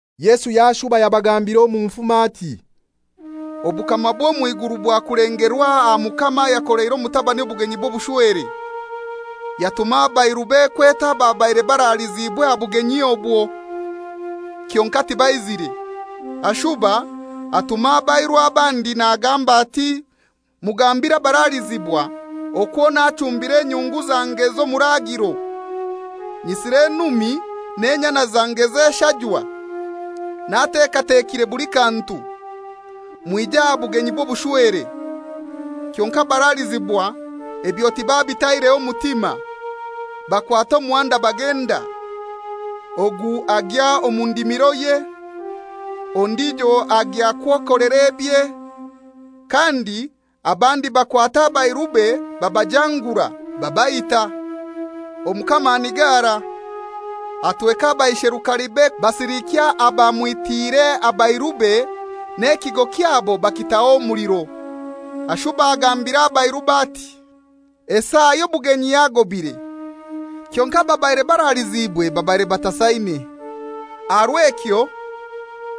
Yesu yashuba yabagambira omu nfumo ati, «Obukama bw'omw'iguru bwakulengerwa aha mukama ayakoleire omutabani obugenyi bw'obushwere. Yatuma abairube kweta ababaire baraliziibwe aha bugenyi obwo; kyonkai tibaizire. Ashuba atuma abairu abandi nagamba ati, ‹Mugambire abaralizibwa okwo nachumbire enyungu zange z'omuraagiro, nyisire enumi n'enyana zange z'eshajwa, natekatekire buli kantu; mwije aha bugenyi bw'obushwere.› Kyonkai abaralizibwa ebyo tibabitaireho mutima, bakwata omuhanda bagenda. Ogu agya omu ndimiroye, ondijo agya kwekolera ebye, kandi abandi bakwata abairube babajangura, babaita. Omukama anigara, atweka abaisherukarebe basilikya abamwitiire abairube n'ekigo kyabo bakitaho omuliro. Ashuba agambira abairube ati, ‹Esaa y'obugenyi yagobire, kyonkai ababaire baraliziibwe babaire batasaine. Aha rw'ekyo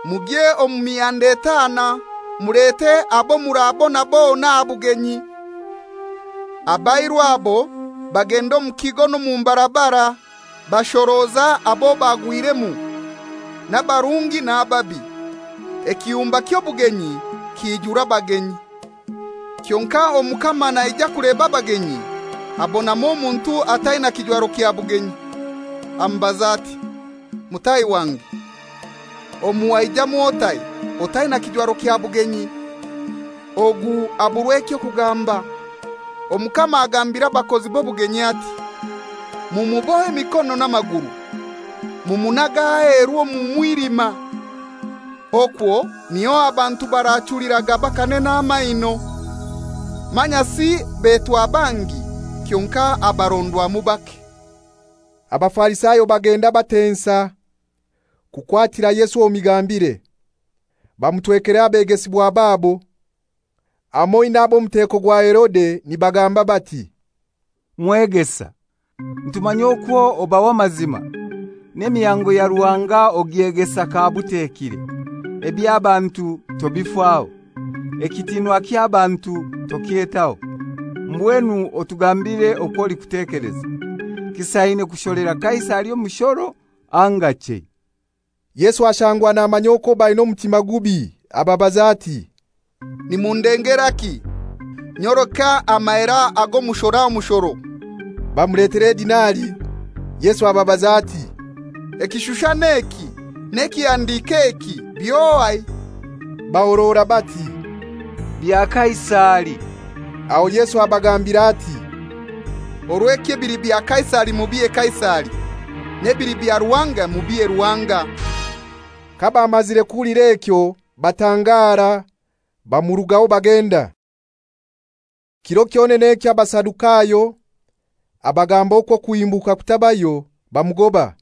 mugye omu mihanda etaana mulete abo murabona bona aha bugenyi.› Abairu abo bagenda omu kigo omu mbarabara bashoroza abo bagwiremu, n'abarungi n'ababi; ekiyumba ky'obugenyi kiijura abagenyi.» «Kyonkai omukama naija kuleba abagenyi abonamu omuntu ataina kijwaro kya bugenyi. Amubaza ati, ‹Mutahi wange, omu waijamu otai otaina kijwaro kya bugenyi?› Ogu aburwa eky'okugamba. Omukama agambira abakozi b'obugenyi ati, ‹Mumubohe emikono n'amaguru, mumunage aheru omu mwilima; okwo niyo abantu barachuliraga bakanena n'amaino.› Manyasi betwa bangi, kyonkai abarondwamu bake.» Abafarisayo bagenda batensa kukwatira Yesu omu migambire. Bamutwekera abegesibwa babo, hamoi n'ab'omuteko gwa Herode, nibagamba bati, «Mwegesa, nitukumanya okwo oba w'amazima, n'emihango ya Ruhanga ogyegesa kabutekire, eby'abantu tobifaho. Ekitiinwa ky'abantu tokyetaho. Mbwenu otugambire okw'olikutekeleza. Kisaine kusholera Kaisari omushoro anga chei?» Yesu ashangwa namanya okwo baina omutima gubi, abaza ati, «Nimundengeraki? Nyoleka amahera ago mushora omushoro.» Bamuletera edinari. Yesu ababaza ati, «Ekishushani eki n'ekihandiiko eki by'ohai?» Bahorora bati, «Bya Kaisari.» Aho Yesu abagambira ati, «Orw'ekyo ebili bya Kaisari mubihe Kaisari, n'ebili bya Ruhanga mubihe Ruhanga.» Kabamazire kuhulira ekyo batangara; bamurugaho bagenda. Kiro kyonene ekyo Abasadukayo abagamba okwo okuhimbuka kutabayo, bamugoba.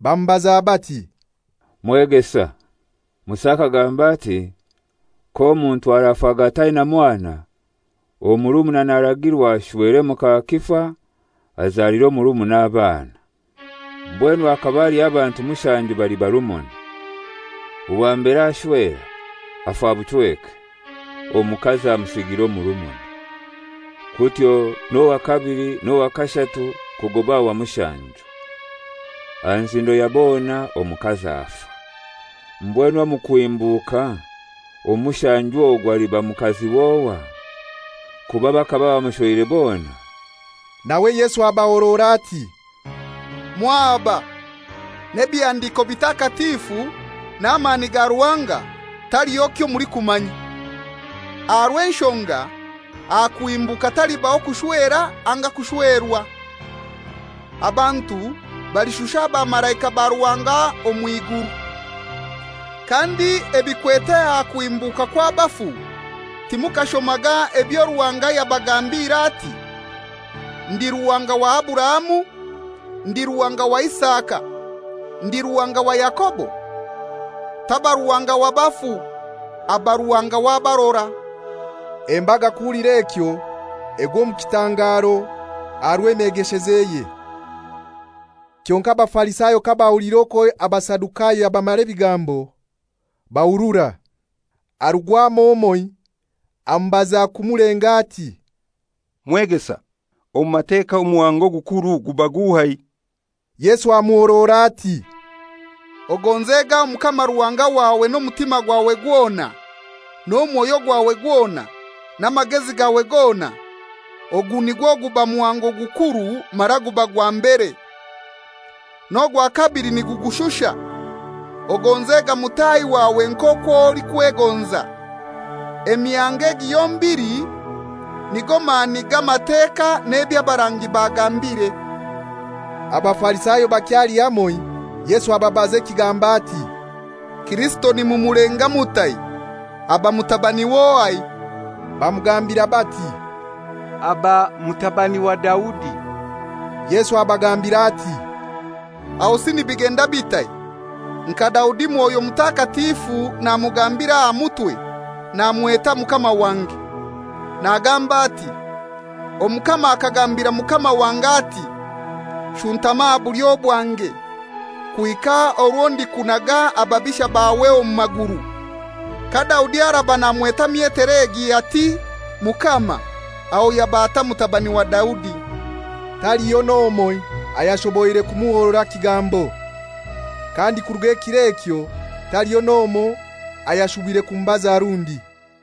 Bamubaza bati, «Mwegesa, Musa akagamba ati, ‹K'omuntu arafaga ataina mwana, omurumuna naragirwa ashwere muka kifa, azalire omurumuna abaana.› Mbwenu hakaba haliho abantu mushanju bali barumuna. Owa mbere ashwera, afa buchweke, omukazi amuhangiira murumuna. Kutyo n'owa kabili n'owa kashatu kugoba aha wa mushanju. Aha nzindo ya bona omukazi afa. Mbwenu omu kuhimbuka, omu mushanju ogwo aliba mukazi w'ohai? Kuba bakaba bamushweire bona.» Nawe Yesu abahorora ati, «Mwahaba. N'ebihandiko bitakatifu na mani ga Ruhanga, taliho kyo mulikumanya. Aha rw'enshonga aha kuhimbuka talibaho kushwera anga kushwerwa. Abantu balishusha abamalaika ba Ruhanga omw'iguru. Kandi ebikwete aha kuhimbuka kw'abafu timukashomaga ebyo Ruhanga yabagambiire ati, ‹Ndi Ruhanga wa Aburahamu, ndi Ruhanga wa Isaka, ndi Ruhanga wa Yakobo?›» «Taba Ruhanga wa bafu, aba Ruhanga w'abarora.» Embaga kuhulira ekyo egwa omu kitangaro aha rw'emyegeshezeye. Kyonkai Abafarisayo kabahuliire okwo Abasadukayo yabamara ebigambo, bahurura. Harugwamu omoi amubaza kumulenga ati, «Mwegesa, omu Mateka omuhango ogukuru guba guhai?» Yesu amuhorora ati, «Ogonzega Omukama Ruhanga wawe n'omutima gwawe gwona, n'omwoyo gwawe gwona, n'amagezi gawe gona. Ogu nigwo guba muhango gukuru mara guba gwa mbere. N'ogwa kabili nigugushusha: Ogonzega mutahi wawe nk'okwo olikwegonza. Emihango egi yombili nigo mani g'Amateka n'eby'abarangi bagambire.» Abafarisayo bakyali hamoi, Yesu ababaza ekigambo ati, «Kirisito nimumulenga mutai? Aba mutabani w'ohai?» Bamugambira bati, «Aba mutabani wa Daudi.» Yesu abagambira ati, «Ahosi nibigenda bitai? Nka Daudi Mwoyo Mutakatifu namugambira aha mutwe namweta ‹Mukama wange,› nagamba ati, ‹Omukama akagambira Mukama wange, ati: Shuntama aha bulyo bwange, kuhika orwo ndikunaga ababisha bawe omu maguru!› Ka Daudi araba namweta myetere egi ati, ‹Mukama,› aho yaba atai mutabani wa Daudi?» Taliho n'omoi ayashoboire kumuhorora kigambo, kandi kuruga kir'ekyo taliho n'omoi ayashubire kumubaza rundi.